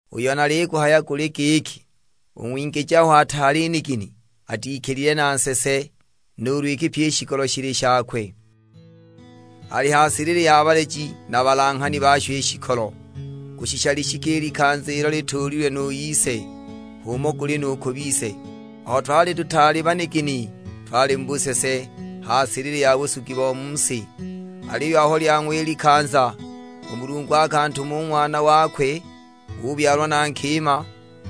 Uyo naliguhaya guli giki, u ng'wingiji aho ataali nigini, atikilile na nsese nuulu iki pyi i shikolo shili shakwe. Ali ha silili ya baleji na balanghani basho i shikolo, kushisha lishike i likanza ilo lituulilwe nu ise. H'umo guli nu ku bise: aho twali tutaali banigini twali mu busese, ha silili ya busugi bo mu si. Aliyo aho lyang'wa i likanza, u Mulungu akantuma u Ng'wana wakwe, ubyalwa na nkima: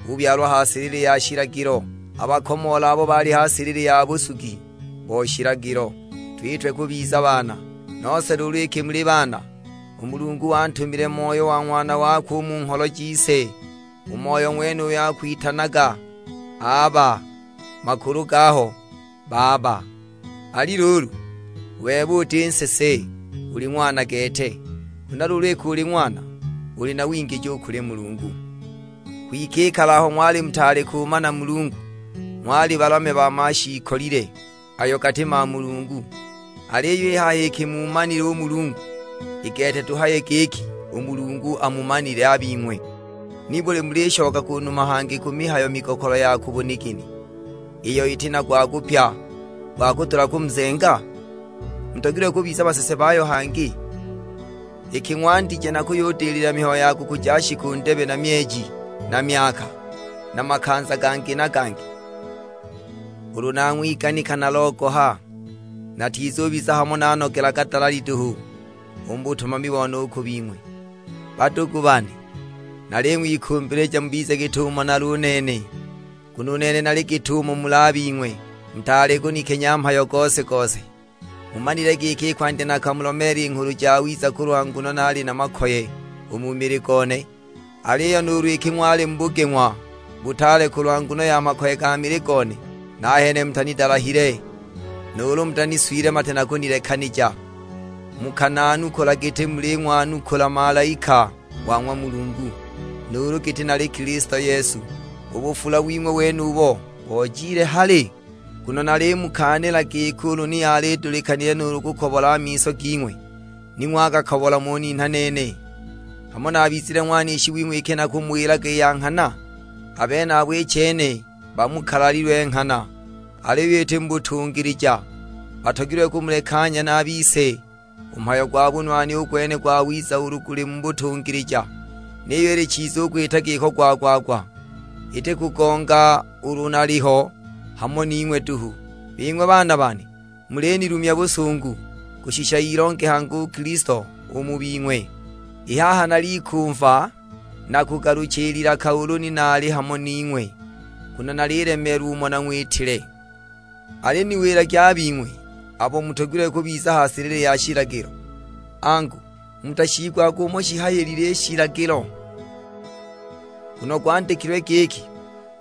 ubyalwa ha silili ya shilagilo, abakomoole abo bali ha silili ya busugi bo shilagilo, twitwe kubiza baana. Nose luulu iki muli baana, u Mulungu wantumile Moyo wa Ng'wana wakwe u mu ngholo jise; u Moyo ng'wenuyo akwitananaga "Aba," makulu gaho "Baba." Ali luulu, u bebe uti nsese, uli ng'wana gete. Huna luulu iki uli ng'wana, uli na wingiji u kuli Mulungu. Kwike i kale aho ng'wali mutaali kumana u Mulungu, ng'wali balamya ba mashiikolile ayo gati mamulungu! Aliyo i haha iki muumanile u Mulungu; i gete tuhaye giki u Mulungu amumanile a bing'we, nibuli mulishoka ku numa hangi ku mihayo migokolo ya ku bunigini, iyo iti na gwa kupya gwa kudula kumuzenga? Mutogilwe kubiza basese bayo hangi? Iki ng'wandije na kuyudilila mihayo ya kukuja shiku ndebe na myeji na myaka, na makanza gangi na gangi! Ulu nang'wiganika nalogoha, natizubiza hamo nanogelaga dalali duhu, u mu butumami bone u ku bing'we! Badugu bane, naling'wikumbilija mubize git'umo nali u nene, nguno u nene nali git'umo muli a bing'we, mutaali kunikenya mhayo gose-gose. Mumanile giki i kwandya nakamulomeela i Nghulu Jawiza kulwa nguno naali na makoye u mu mili gone. Aliyo nuulu iki ng'wali mu bugeng'wa butaale kulwa nguno ya makoye ga mili gone, nahene mutanidalahile, nuulu mutaniswile mate na kunilekanija! Mukananukula giti muling'wanukula malaika wa ng'wa Mulungu, nuulu giti nali Kilisto Yesu! U bufula wing'we wenubo, bojile hali? Nguno nalimukaanila giki ulu ni yali idulikanile nuulu kukobola miso ging'we, ni ng'wagakobola ng'uninha nene! Hamo nabizile ng'wanishi wing'we iki nakumuwilaga i ya nghana? A benabo i chene bamukalalilwe nghana; aliyo iti mu butungilija, batogilwe kumulekanya na a bise. U mhayo gwa bunwani u gwene gwawiza ulu guli mu butungilija, niyo ili chiza u kwita giko gwa-gwa-gwa; iti kugonga ulu naliho hamo ning'we duhu. Bing'we baana bane, mulinilumya busungu kushisha ilonge hangi u Kilisto u mu bing'we! I haha nalikumva na kugalucha i lilaka ulu ni nali hamo ning'we; nguno nalilemeelwa umo nang'witile! Aliniwilagi a bing'we abo mutogilwe kubiza ha silili ya shilagilo; angu, mutashiigwaga umo shihayilile i shilagilo? Nguno gwandikilwe giki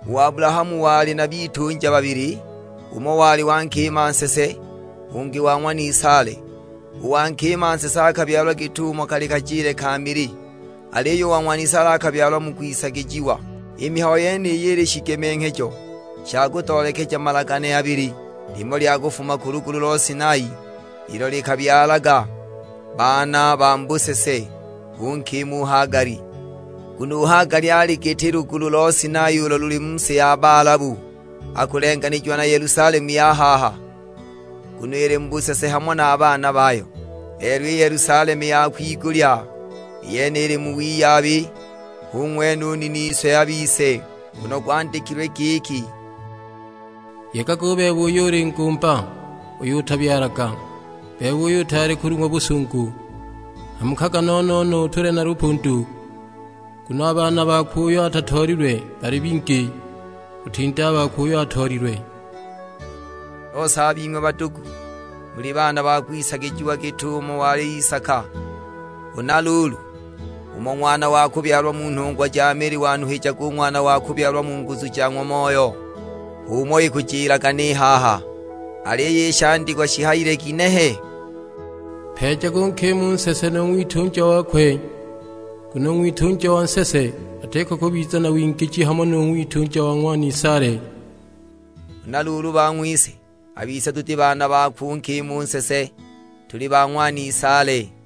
u Abulahamu wali na bitunja babili, umo wali wa nkima nsese, ungi wa ng'wanisaale. U wa nkima u nsese akabyalwa git'umo kali kajile ka mili, aliyo u wa ng'wanisaale akabyalwa mu kwisagijiwa. I mihayo yeniyi ili shigemenghejo sha kutoolekeja malagane abili, limo lya kufuma ku lugulu lo Sinai, ilo likabyalaga baana ba mu busese; hu nkima u Hagali. Nguno u Hagali ali giti lugulu lo Sinai ulo luli mu si ya Balabu; akulenganijiwa na Yelusalemu ya haha, nguno ili mu busese hamo na a baana bayo. Lelo i Yelusalemu ya kwigulya, i yene ili mu wiyabi; hu ng'wene u niniswe a bise. Nguno gwandikilwe giki, "Yegaga u bebe uyo uli ngumba, uyo utabyalaga. Bebe uyo utaali kulung'wa busungu, hamukaga no-no-no, utule na lupundu. Nguno a baana bakwe uyo atatoolilwe bali bingi, kutinda a bakwe uyo atoolilwe." Nose a bing'we badugu, muli baana ba kwisagijiwa git'umo wali Isaka. Huna luulu, umo ng'wana wa kubyalwa mu nhungwa ja mili wanuhijaga u ng'wana wa kubyalwa mu nguzu ja ng'wa Moyo, h'umo ikujilaga ni haha. Aliyo i shandikwa shihayile ginehe? "Mpeejage u nkima u nsese nu ng'witunja wakwe, nguno u ng'witunja wa nsese atiko kubiza na wingiji hamo nu ng'witunja wa ng'wanisaale!" Huna luulu bang'wise, a bise tuti baana bakwe u nkima u nsese, tuli ba ng'wanisaale.